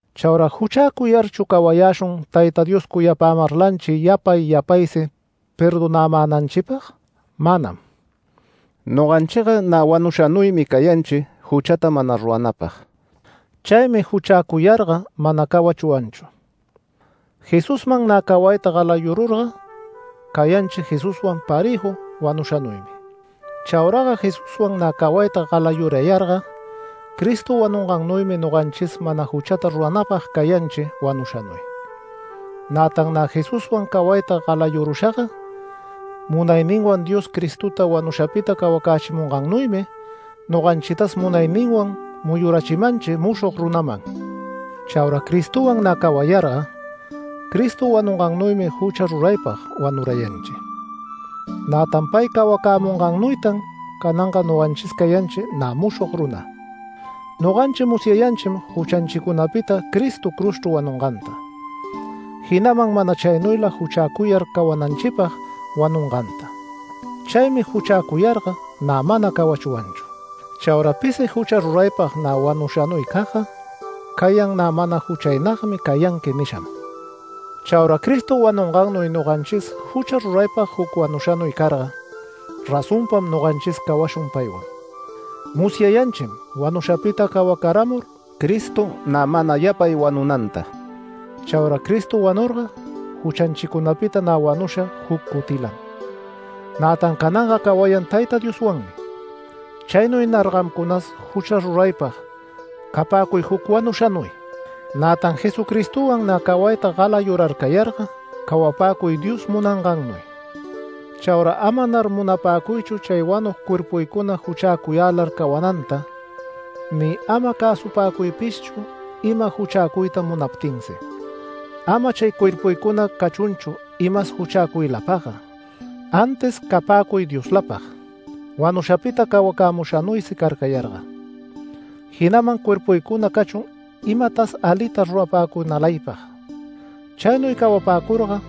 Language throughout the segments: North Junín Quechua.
Chaura ¿juchäcuyarchu cawayäshun Tayta Dios cuyapämarlanchi yapay yapaysi perdonämänanchipag? Manam. Noganchiga nä wanushanuymi cayanchi juchata mana ruranapag. Chaymi juchäcuyarga mana cawachwanchu. Jesuswan nä cawayta galayururga cayanchi Jesuswan parëju wanushanuymi. Chauraga Jesuswan nä cawayta galayurayarga Cristo wanungannuymi noganchis mana juchata ruranäpag cayanchi wanushanuy. Nätan nä Jesuswan cawayta galayurushaga, munayninwan Dios Cristota wanushapita cawacächimungannuymi noganchitas munayninwan muyurachimanchi mushog runaman. Chaura Cristowan nä cawayarga Cristo wanungannuymi jucha ruraypag wanurayanchi, nätan pay cawacämungannuytan cananga noganchis cayanchi nä mushog runa. Noganchi musyayanchim juchanchicunapita Cristo cruzchru wanunganta, jinaman mana chaynuyla juchäcuyar cawananchipag wanunganta. Chaymi juchäcuyarga nä mana cawachwanchu. Chaura pisi jucha ruraypag nä wanushanuycagga cayan nä “Mana juchaynagmi cayanqui” nisham. Chaura Cristo wanungannuy noganchis jucha ruraypag juc wanushanuy carga, razonpam noganchis cawashun paywan. Musyayanchim wanushapita cawacaramur Cristo nä mana yapay wanunanta. Chaura Cristo wanurga, juchanchicunapita nä wanusha juc cutilam, nätan cananga cawayan Tayta Dioswanmi. Chaynuynar gamcunas jucha ruraypag capäcuy juc wanushanuy, nätan Jesucristowan nä cawayta galayurarcayarga cawapäcuy Dios munangannuy. Chaura amanar munapäcuychu chay wanug cuerpuycuna juchäcuyälar cawananta ni ama cäsupäcuypishchu ima juchäcuyta munaptinsi. Ama chay cuerpucuna cachunchu imas juchäcuylapagga, antis capäcuy Dioslapag wanushapita cawacämushanuysi carcayarga. Jinaman cuerpuycuna cachun imatas alita rurapäcunalaypag. Chaynuy cawapäcurga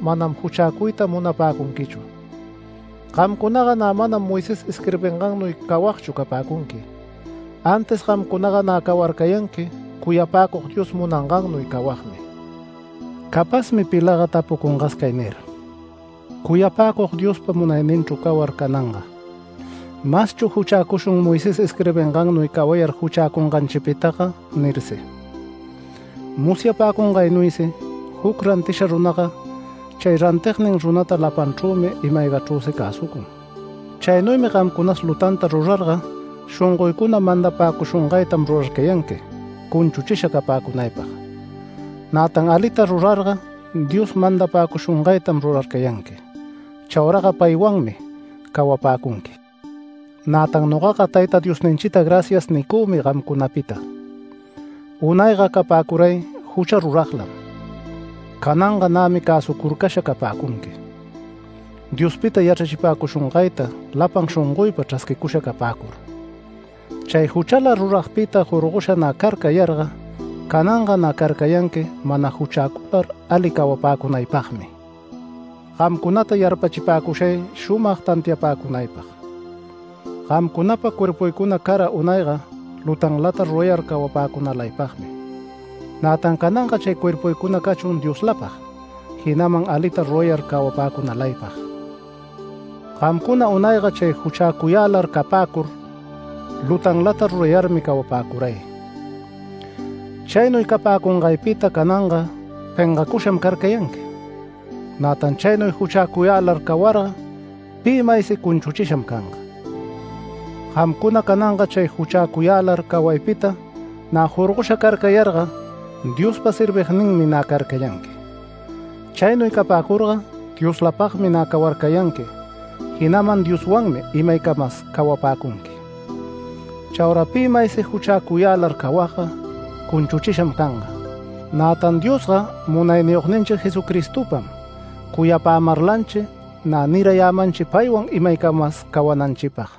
manam juchäcuyta munapäcunquichu. Gamcunaga nä manam Moisés isquirbingannuy cawagchu capäcunqui, antis gamcunaga nä cawarcayanqui cuyapäcug Dios munangannuy cawagmi. Capazmi pilaga tapucungas cay nir: “Cuyapäcug Diospa munayninchru cawar cananga ¿maschu juchäcushun, Moisés isquirbingannuy cawayar juchäcunganchitaga?” nirsi. Musyapäcungaynuysi juc rantisha runaga chay rantignin runata lapanchrümi ima-aygachrüsi cäsucun. Chaynuymi gamcunas lutanta rurarga shongoycuna mandapäcushungaytam rurarcayanqui cunchuchisha capäcunaypag. Nätan alita rurarga Dios mandapäcushungaytam rurarcayanqui. Chauraga paywanmi cawapäcunqui. Nätan nogaga Tayta Diosninchita “Gracias” nicümi gamcunapita. Unayga capäcuray jucha ruraglam. Cananga nämi cäsucurcasha capäcunqui, Diospita yachrachipäcushungayta lapan shongoypa chrasquicusha capäcur. Chay juchala ruragpita jorgosha nä carcayarga cananga nä carcayanqui mana juchäcular ali cawapäcunaypagmi. Gamcunata yarpachipäcushay shumag tantiapäcunaypag: Gamcunapa cuerpuycuna cara unayga lutanlata rurayar cawapäcunalaypagmi, nätan cananga chay cuerpuycuna cachun Dioslapag jinaman alita rurayar cawapäcunalaypag. Gamcuna unayga chay juchacayälar capäcur lutanlata rurayarmi cawapäcuray. Chaynuy capäcungaypita cananga pengacusham carcayanqui, nätan chaynuy juchäcuyälar cawarga pi maysi cunchuchisham canga. Gamcuna cananga chay juchäcuyälar cawaypita nä jorgosha carcayarga Diospa servigninmi nä carcayanqui. Chaynuy capäcurga Dioslapagmi nä cawarcayanqui, jinaman Dioswanmi imaycamas cawapäcunqui. Chaura pi maysi juchäcuyälar cawagga cunchuchisham canga, nätan Diosga Munayniyogninchi Jesucristopam cuyapämarlanchi nä nirayämanchi paywan imaycamas cawananchipag.